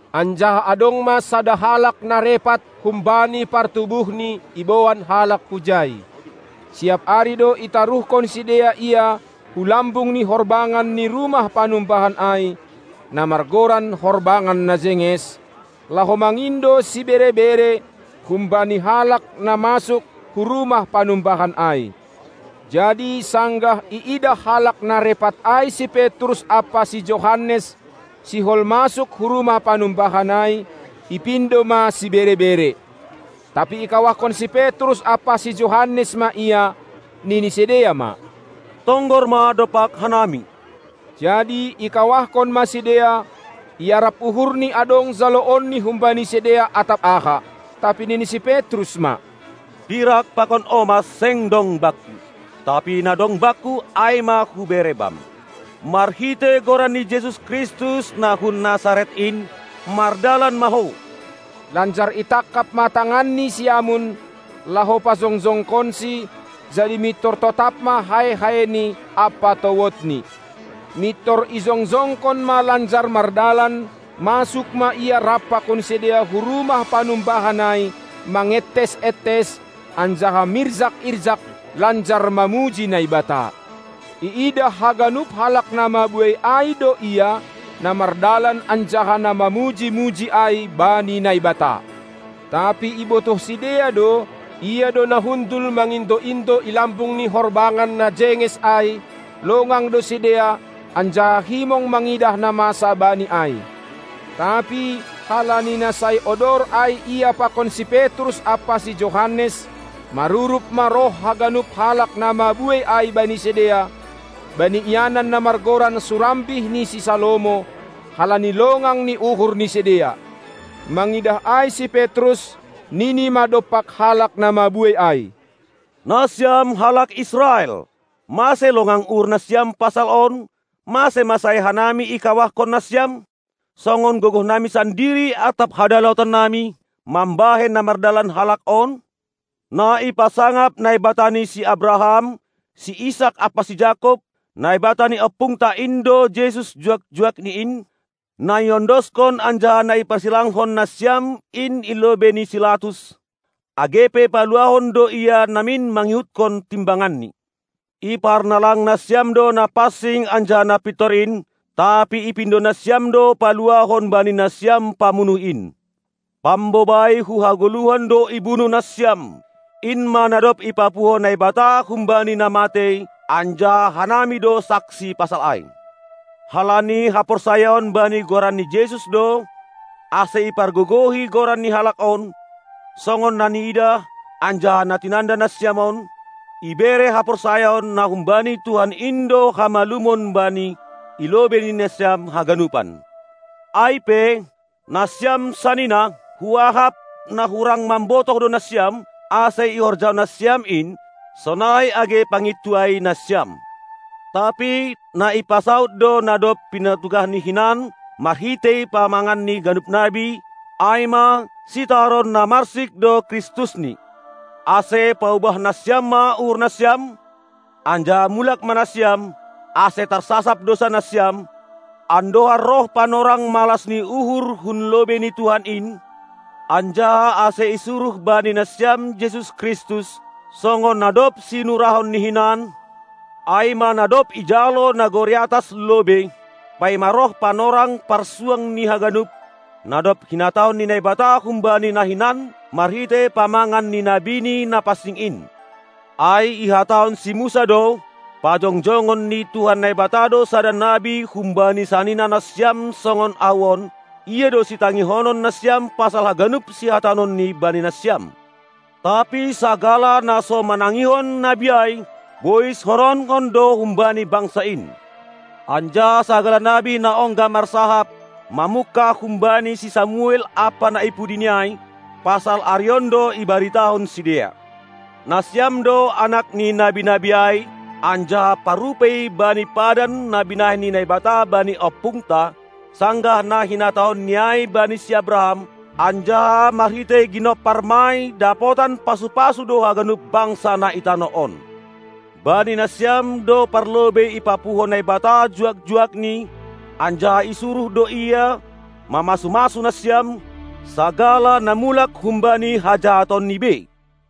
Anjaha adong ma sada halak na repat humbani partubuhni iboan halak hujai. Siap ari do itaruhkon sidea ia hu lambung ni horbangan ni rumah panumbahan ai, na margoran Horbangan Na Jenges, laho mangindo sibere-bere humbani halak na masuk hu rumah panumbahan ai. Jadi sanggah iidah halak na repat ai si Petrus ampa si Johannes sihol masuk hu rumah panumbahan ai, ipindo ma sibere-bere. Tapi ikawahkon si Petrus ampa si Johannes ma ia, nini sidea ma: Tonggor ma dompak hanami! Jadi ikawahkon ma sidea, iarap uhurni adong jaloonni humbani sidea atap aha. Tapi nini si Petrus ma: Pirak pakon omas seng dong bakku, tapi na dong bakku ai ma hubere bam: Marhitei Goran ni Jesus Kristus na hun Nasaret in, mardalan ma ho! Lanjar itangkap ma tanganni siamun, laho pajongjongkonsi, jadi mintor totap ma hae-haeni ampa towodni. Mintor ijongjongkon ma lanjar mardalan, masuk ma ia rap pakon sidea hu rumah panumbahan ai mangentes-entes anjaha mirjak-irjak lanjar mamuji Naibata. Iidah haganup halak na mabuei ai do ia, na mardalan anjaha na mamuji-muji ai bani Naibata. Tapi ibotoh sidea do, ia do na hundul mangindo-indo i lambung ni horbangan na majenges ai; longang do sidea anjaha himong mangidah na masa bani ai. Tapi halani na sai odor ai ia pakon si Petrus ampa si Johannes, marurup ma roh haganup halak na mabuei ai bani sidea, bani ianan na margoran surambih ni si Salomo, halani longang ni uhur ni sidea. Mangidah ai si Petrus, nini ma dompak halak na mabuei ai: Nasiam halak Israel, mase longang uhurnasiam pasal on, mase ma sai hanami ikawahkon nasiam, songon gogohnami sandiri atap hadaulatonnami mambahen na mardalan halak on? Na ipasangap Naibata ni si Abraham, si Isak ampa si Jakob, Naibata ni ompungta in do Jesus juak-juakni in, na iondoskon anjaha na iparsilangkon nasiam in i lobei ni si Latus, age pe paluahon do Ia namin mangihutkon timbanganni. Iparnalang nasiam do Napansing anjaha Napintor in, tapi ipindo nasiam do paluahon bani nasiam pamunuh in. Pambobai hu hagoluhan do ibunuh nasiam. In ma na dob ipapuho Naibata humbani na matei, anjaha hanami do saksi pasal ai. Halani haporsayaon bani Goran ni Jesus do, ase ipargogohi Goran ni halak on, songon na niidah, anjaha na tinanda nasiam on; ibere haporsayaon na humbani Tuhan in do hamalumon bani i lobei nasiam haganupan. Ai pe, nasiam sanina, huahap, na hurang mambotoh do nasiam, ase ihorjahon nasiam in, sonai age pangintuai nasiam. Tapi na ipasaud do na dob pinatugahni hinan marhitei pamangan ni ganup nabi, ai ma: Sitaron na marsik do Kristusni. Ase paubah nasiam ma uhurnasiam, anjaha mulak ma nasiam, ase tarsasap dousanasiam, andohar roh panorang malas ni uhur hun lobei ni Tuhan in, anjaha ase isuruh bani nasiam Jesus Kristus, songon na dob sinurahonni hinan, ai ma na dob ijalo nagori atas lobei, paima roh panorang parsuang ni haganup, na dob hinatahon ni Naibata humbani na hinan marhitei pamangan ni nabiNi na pansing in. Ai ihatahon si Musa do: Pajongjongon ni Tuhan Naibata do sada nabi humbani sanina nasiam songon ahu on, Ia do sitangihonon nasiam pasal haganup sihatahononni bani nasiam. Tapi sagala na so manangihon nabi ai, boishononkon do humbani bangsa in! Anjaha sagala nabi na ongga marsahap, mamungkah humbani si Samuel ampa na ipudini ai, pasal ari on do ibaritahon sidea. Nasiam do anak ni nabi-nabi ai anjaha parrupei bani padan na binahen ni Naibata bani ompungta, sanggah na hinatahonni ai bani si Abraham: Anjaha marhitei ginomparmai dapotan pasu-pasu do haganup bangsa na i tanoh on. Bani nasiam do parlobei ipapuho Naibata juak-juakNi, anjaha isuruh do ia, mamasu-masu nasiam, sagala na mulak humbani hajahatonni bei.